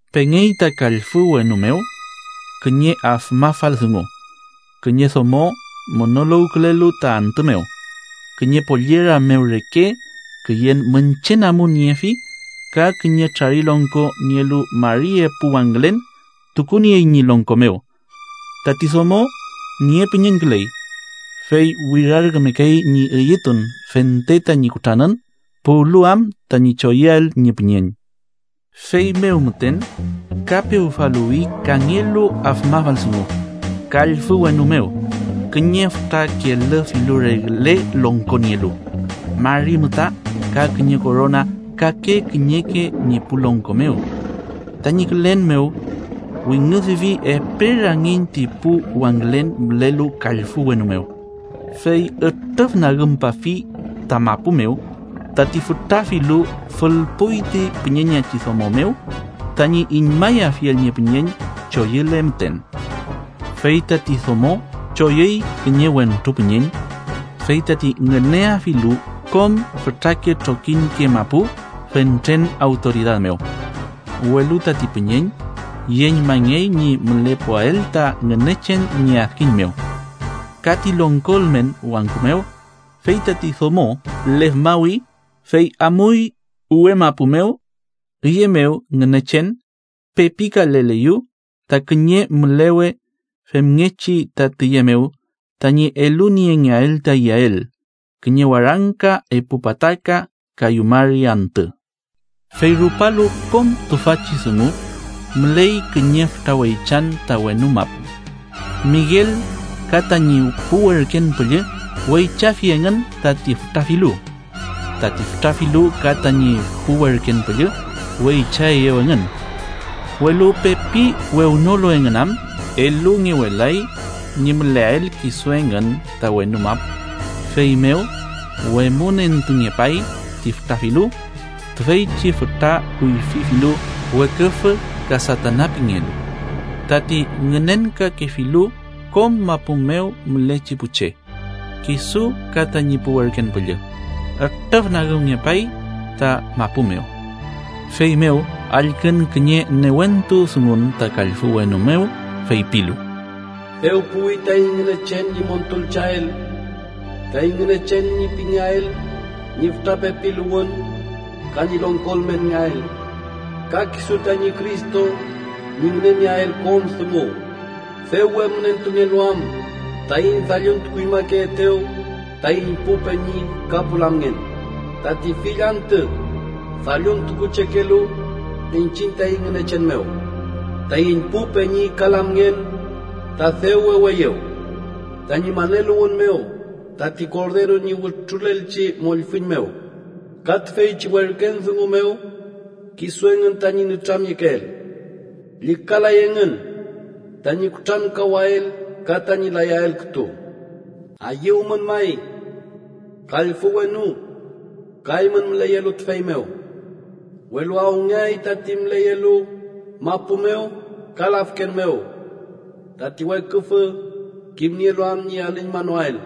Pengey ta kallfü wenu mew kiñe afmafal dungu: kiñe domo munuluwkülelu ta antü mew, kiñe pollera mew reke, küyen miñche namun niefi ka kiñe trarilongko nielu mari epu wangülen tukuniey ñi longko mew. Tati domo niepüñeñküley, fey wirarkümekey ñi eyütun fente tañi kutranün puwlu am tañi choyüael ñi püñeñ. Feymew müten ka pewfaluwi kangelu afmafal dungu kallfü wenu mew: Kiñe fütra kelü filu regle longko nielu, mari müta ka kiñe korona kake kiñeke ñi pu longko mew. Tañi külen mew wingüdüfi epe rangiñ ti pu wangülen mülelu kallfü wenu mew, fey ütrüfnagümpafi ta mapu mew. Tati fütra filu fülpuy ti püñeñachi domo mew, tañi iñmayafiel ñi püñeñ choyüle müten. Fey tati domo choyüy kiñe wentru püñeñ, fey tati ngüneafilu kom fütrake trokiñke mapu fentren awtoridad mew. Welu tati püñeñ yeñmangey ñi mülepuael ta Ngünechen ñi adkiñ mew ka ti longko ülmen wangku mew, fey tati domo lefmawi, fey amuy uwe mapu mew, üye mew Ngünechen pepikaleleyew ta kiñe mülewe femngechi ta tiye mew tañi eluniengeael ta iyael kiñe warangka epu pataka kayu mari antü. Fey rupalu kom tüfachi dungu müley kiñe fütra weychan ta wenu mapu. Miguel ka tañi pu werken püllü weychafi engün tati fütra filu. Tati fütra filu ka tañi pu werken püllü weychaeyew engün, welu pepi wewnolu engün am, elungewelay ñi müleael kisu engün ta wenu mapu. Feymew wemünentungepay ti fütra filu, tiyechi fütra kuyfi filu Weküfü ka Satana pingelu, tati ngünenkakefilu kom mapu mew mülechi pu che. Kisu ka tañi pu werken püllü ütrüfnagümngepay ta mapu mew. Feymew allkün kiñe newentu dungun ta kallfü wenu mew, feypilu: “Dew puwi taiñ Ngünechen ñi montulcheael, taiñ Ngünechen ñi pengelael ñi fütra pepiluwün ka ñi longko ülmenngeael ka kisu tañi Cristo ñi ngünenieael kom dungu, dew wemünentungelu am taiñ dalluntukuñmakeetew taiñ pu peñi ka pu lamngen, tati fill antü dalluntukuchekelu iñchiñ taiñ Ngünechen mew. Taiñ pu peñi ka lamngen ta dew weweyew, tañi maneluwün mew tati Korderu ñi wütrulelchi mollfüñ mew, ka tüfeychi werken dungu mew kisu engün tañi nütramyekeel, llükalay engün tañi kutrankawael ka tañi layael kütu. ¡Ayüwmün, may, kallfü wenu, ka eymün müleyelu tüfey mew! ¡Welu awngeay tati müleyelu mapu mew ka lafken mew, tati weküfü, kimnielu am ñi alüñmanoael,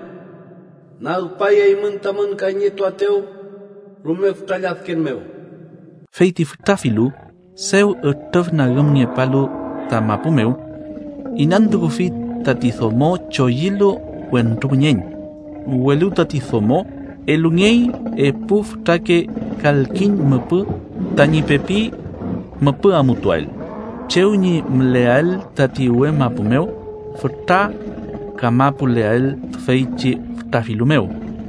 nagpay eymün tamün kayñetuaetew rume fütra lladken mew!” Fey ti fütra filu, dew ütrüfnagümngepalu ta mapu mew, inantukufi tati domo choyülu wentru püñeñ. Welu tati domo elungey epu fütrake kalkiñ müpü tañi pepi müpü amutuael chew ñi müleael tati uwe mapu mew, fütra kamapuleael tüfeychi fütra filu mew,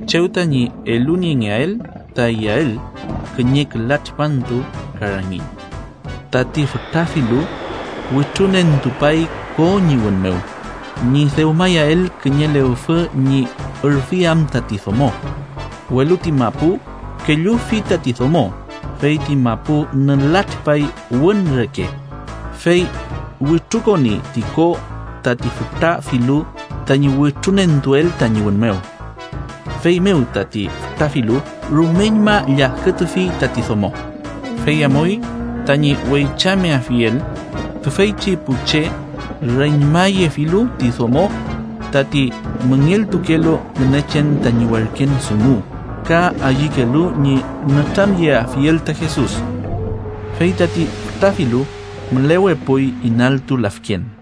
chew tañi eluniengeael ta iyael kiñe küla tripantu ka rangiñ. Tati fütra filu wütrunentupay ko ñi wün mew, ñi dewmayael kiñe lewfü ñi ürfiam tati domo. Welu ti mapu kellufi tati domo, fey ti mapu nülatripay wün reke, fey wütrukoni ti ko tati fütra filu tañi wütrunentuel tañi wün mew. Feymew tati fütra filu rumeñma lladkütufi tati domo, fey amuy tañi weychameafiel tüfeychi pu che reñmayefilu ti domo tati müngeltukelu Ngünechen tañi werken dungu ka ayükelu ñi nütramyeafiel ta Jesus. Fey tati fütra filu mülewepuy inaltu lafken.